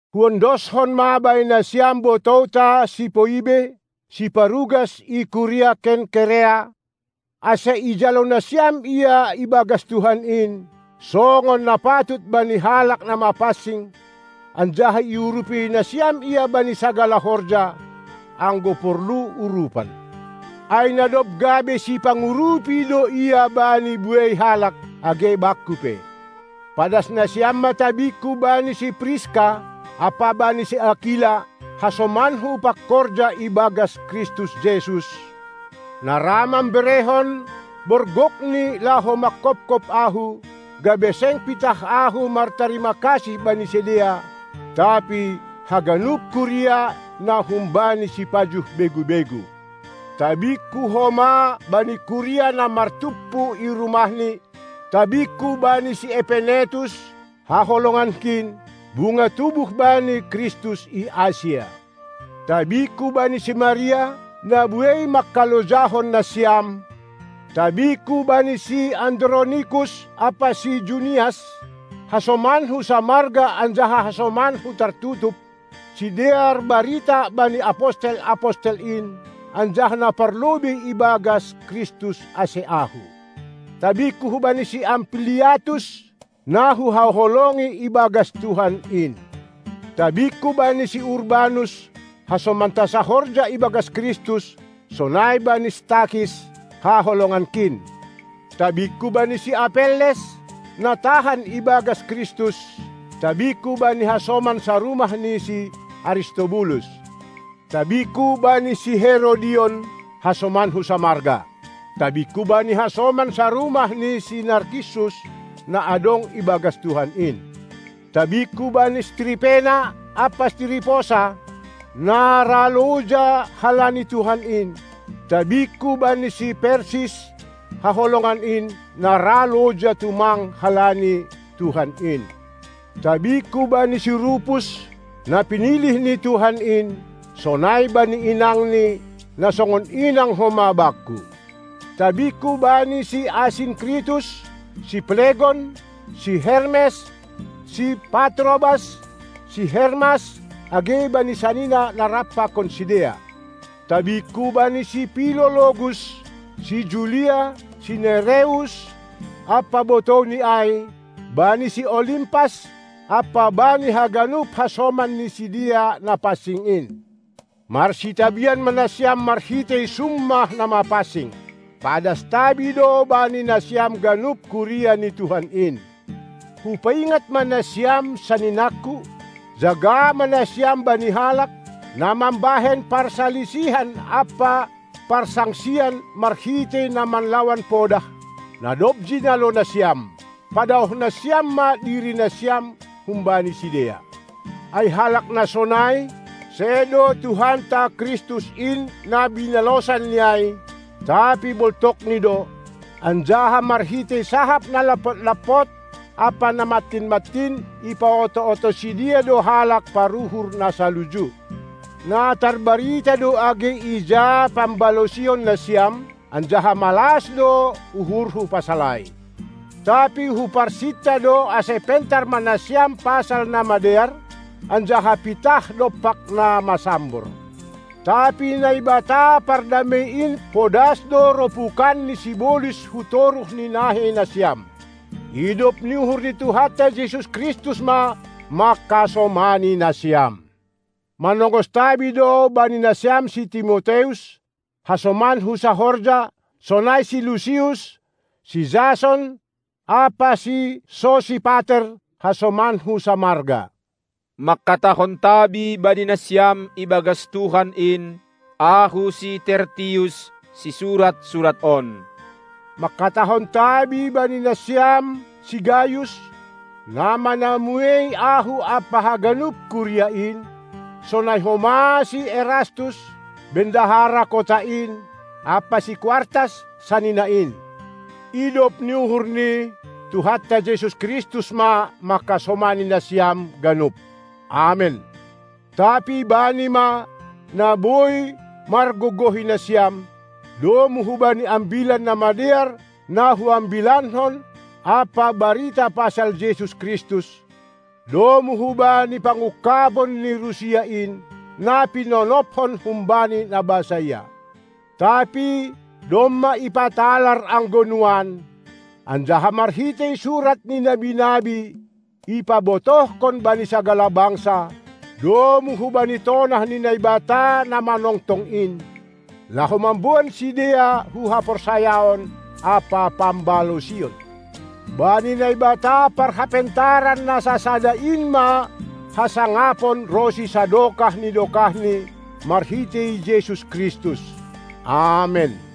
Huondoskon ma bani nasiam botouta si Poibe, siparugas i kuria Kenkerea, ase ijalo nasiam ia ibagas Tuhan in, songon na patut bani halak na mapansing, anjaha iurupi nasiam ia bani sagala horja, anggo porlu urupan. Ai na dob gabe sipangurupi do ia bani buei halak, age bakku pe. Padas nasiam ma tabingku bani si Priska ampa bani si Akila, hasomanku pangkorja ibagas Kristus Jesus, na ra mamberehon borgokni laho mangkophop ahu, gabe seng pitah ahu martarima kasih bani sidea, tapi haganup kuria na humbani sipajuh begu-begu. Tabingku homa bani kuria na martumpu i rumahni. Tabingku bani si Epenetus, haholongankin, bunga tubuh bani Kristus i Asia. Tabingku bani si Maria, na buei mangkalojahon nasiam. Tabingku bani si Andronikus ampa si Junias, hasomanku samarga anjaha hasomanku tartutup, sidear barita bani apostel-apostel in, anjaha na parlobei ibagas Kristus ase ahu. Tabingku bani si Ampliatus, na huhaholongi ibagas Tuhan in. Tabingku bani si Urbanus, hasomanta sahorja ibagas Kristus, sonai bani si Stakis, haholongankin. Tabingku bani si Apelles, na tahan ibagas Kristus. Tabingku bani hasoman sarumah ni si Aristobulus. Tabingku bani si Herodion, hasomanku samarga. Tabingku bani hasoman sarumah ni si Narkissus, na adong ibagas Tuhan in. Tabingku bani si Tripena ampa si Triposa, na ra loja halani Tuhan in. Tabingku bani si Persis, haholongan in, na ra loja tumang halani Tuhan in. Tabingku bani si Rupus, na pinilih ni Tuhan in, sonai bani inangni, na songon inang homa bakku. Tabingku bani si Asinkritus, si Plegon, si Hermes, si Patrobas, si Hermas, age bani sanina na rap pakon sidea. Tabingku bani si Pilologus, si Julia, si Nereus ampa botouni ai, bani si Olimpas ampa bani haganup hasoman ni sidea na pansing in. Marsitabian ma nasiam marhitei summah na mapansing. Padas tabi do bani nasiam ganup kuria ni Tuhan in. Hupaingat ma nasiam, saninangku, jaga ma nasiam bani halak, na mambahen parsalisihan ampa parsangsian marhitei na manlawan podah, na dob jinalo nasiam. Padaoh nasiam ma dirinasiam humbani sidea. Ai halak na sonai, sedo Tuhanta Kristus in na binalosanni ai, tapi boltokni do, anjaha marhitei sahap na lampot-lampot ampa na mantin-mantin ipaoto-oto sidea do halak paruhur na saluju. Na tarbarita do age ija pambalosionnasiam, anjaha malas do uhurhu pasal ai. Tapi huparsinta do ase pentar ma nasiam pasal na madear, anjaha pitah dompak na masambor. Tapi Naibata Pardamei in podas do ropukanni sibolis hu toruh ni naheinasiam. Idop ni uhur ni Tuhanta Jesus Kristus ma mangkasomani nasiam! Manongos tabi do bani nasiam si Timoteus, hasomanku sahorja, sonai si Lusius, si Jason ampa si Sosipater, hasomanku samarga. Mangkatahon tabi bani nasiam ibagas Tuhan in, ahu si Tertius, sisurat surat on. Mangkatahon tabi bani nasiam si Gayus, na manamuei ahu ampa haganup kuria in, sonai homa si Erastus, bendahara kota in, ampa si Kuartas, sanina in. Idop ni uhur ni Tuhanta Jesus Kristus ma mangkasomani nasiam ganup! Amen. Tapi Bani ma, na boi margogohi nasiam, domu hubani Ambilan Namadear na huambilankon ampa barita pasal Jesus Kristus, domu hubani pangungkabon ni rusia in, na pinonophon humbani na basaia, tapi domma ipatalar anggo nuan, anjaha marhitei surat ni nabi-nabi ipabotohkon bani sagala bangsa, domu hubani tonah ni Naibata na manongtong in, laho mamboan sidea hu haporsayaon ampa pambalosion: Bani Naibata parhapentaran na sasada in ma hasangapon ronsi sadokah ni dokahni marhitei Jesus Kristus! Amen.